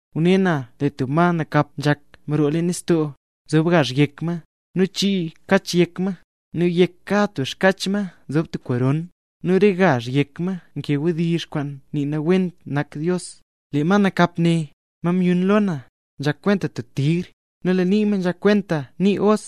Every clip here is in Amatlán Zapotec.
Ngune na lee tub ma nakap nzhak mroo leen nistoo. Nzob gazh yek ma, nu chii xkach yek ma. Nu yek kad tub xkach ma nzob tub koron, nu re gazh yek ma nkee wdizh, kwaan nii nawent nak Dios. Lee ma nakap ne, ma myun lo na, nzhak kwenta tub tigr; nu lee nii ma nzhak kwenta nii os,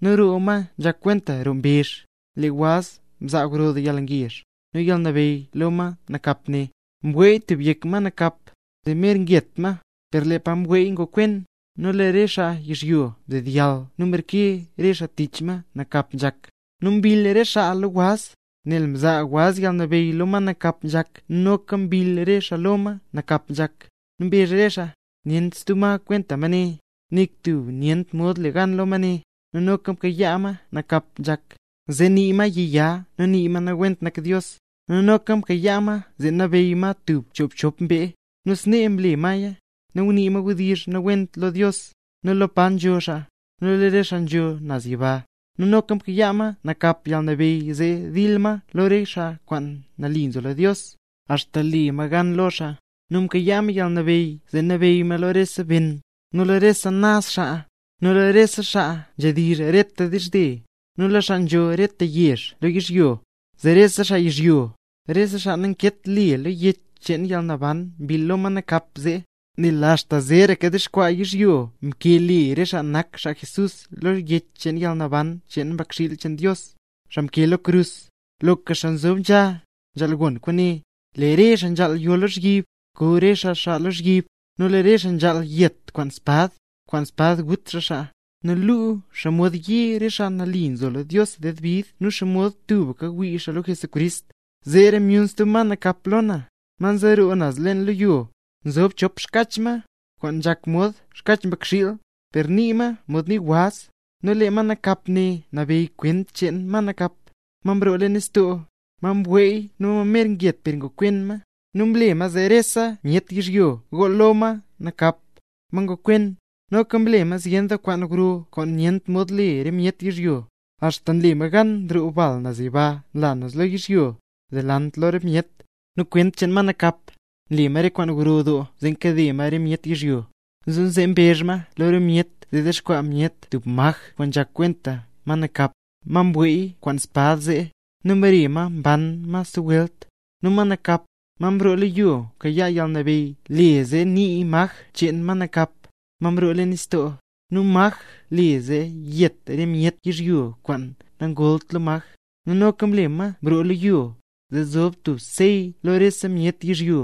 nu lee roo ma nzhak kwenta roo mbezh. Lee waz mzaa gro doo yalngezh, nu yalnabeyy lo ma nakap ne. Mweey tub yek ma nakap, zee mer nget ma, per lee pa mweey ngokwen. Nu lee re xaa yizhyo mdedyall nu mreke re xaa tich ma nakap nzhak. Nu mbill re xaa lo waz, nel mzaa waz yalnabeyy lo ma nakap nzhak, nu noka mbill re xaa lo ma nakap nzhak, nu mbezh re xaa: —Nyent stub ma kwenta ma ne, nik tub nyent mod le gan lo ma ne. Nu noka mkayaa ma nakap nzhak, zee nii ma yiya nu nii ma nawent nak Dios, nu noka mkayaa ma zee nabeyy ma tub choobchop mbee. Nu snee mle maya; ngunii ma wdizh nawent lo Dios, nu lo pa nzho xaa, nu lo re xaa nzho naz yiba. Nu noka mkayaa ma nakap yalnabeyy zee mdil lo re xaa kwaan mle nambey Jesús, axta le ma gan lo xaa; nu mkayaa ma yalnabeyy zee nabeyy ma lo rese ben, lo rese naz xaa, lo rese xaa nzhedizh reta dizhze, nu lo xaa nzho rese yezh lo yizhyo. Zee rese xaa yizhyo, re xaa namkeet le lo Yech cheen Yalnaban mbill lo ma nakap zee. Nel axta zeeraka dexkwaa yizhyo mkee le re xaa nak xaa Jesús lo Yech cheen Yalnaban cheen Mbakxiil cheen Dios, xaa mkee lo krus. Loka xaa nzob nzha, nzhaal gon kwaane: Lee re xaa nzhaal yo lozhyib, ko re xaa xaa lozhyib; nu lee re xaa nzhaal yet kwaan espad, kwaan espad gut xaa xaa. Nee luu xomod nye nzo re xaa mle nambey Jesús ded bid nu xomod tubka ngwii xaa lo xaa. Zeera myun stub ma nakap lo na, ma nzeroo naz leen lo yo. Nzob chop xkach ma, kwaan nzhak mod xkach mbakxiil, per nii ma mod nii waz. Nu lee ma nakap ne nabeyy kwent cheen ma nakap, ma mroo leen nistoo, ma mweey nu ma mer nget per ngokwen ma. Nu nle ma zee rese myet yizhyo gool lo ma nakap, ma ngokwen. Noka nle ma zyen doo kwaan gro kwaan nyent mod le re myet yizhyo. Axta mle ma gan nroo bal naz yiba nlaya naz lo yizhyo, delant lo re myet. Nu kwent cheen ma nakap, nle ma re kwaan gro doo zee kade ma re myet yizhyo. Nu zee mbezh ma lo re myet zee dexkwaa myet tub maj kwaan nzhak kwenta ma nakap, ma mweey kwaan espad zee, nu mbare ma mban ma stub welt. Nu ma nakap, ma mroo lo yo mkayaa yalnabeyy le zee nii maj cheen ma nakap, ma mroo leen nistoo. Nu maj le zee yet rese myet yizhyo kwaan nagoolt lo maj. Nu noka mle ma mroo lo yo, zee zob tub sey lo rese myet yizhyo.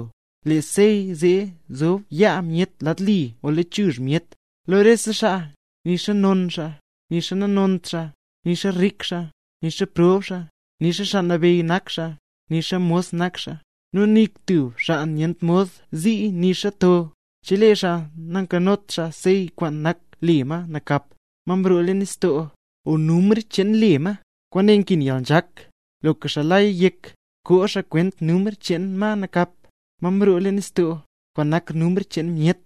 Lee sey ne zob yaa myet lad li o lechuzh myet, lo rese xaa, nixa non xaa, nixa nanont xaa; nixa rik xaa, nixa prob xaa; nixa xaa nabeyy nak xaa; nixa mos nak xaa. Nu nik tub xaa nyent mod zii nixa to, chelee xaa nankanot xaa sey kwaan nak le ma nakap, ma mroo leen nistoo, o numr cheen le ma. Kwaane nkin yalnzhak; loka xaa nlaya yek, koo xaa kwent numr cheen ma nakap, ma mroo leen nistoo, kwaan nak numr cheen myet.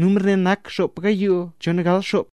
Numr ne nak xop gayoo chon gal xop.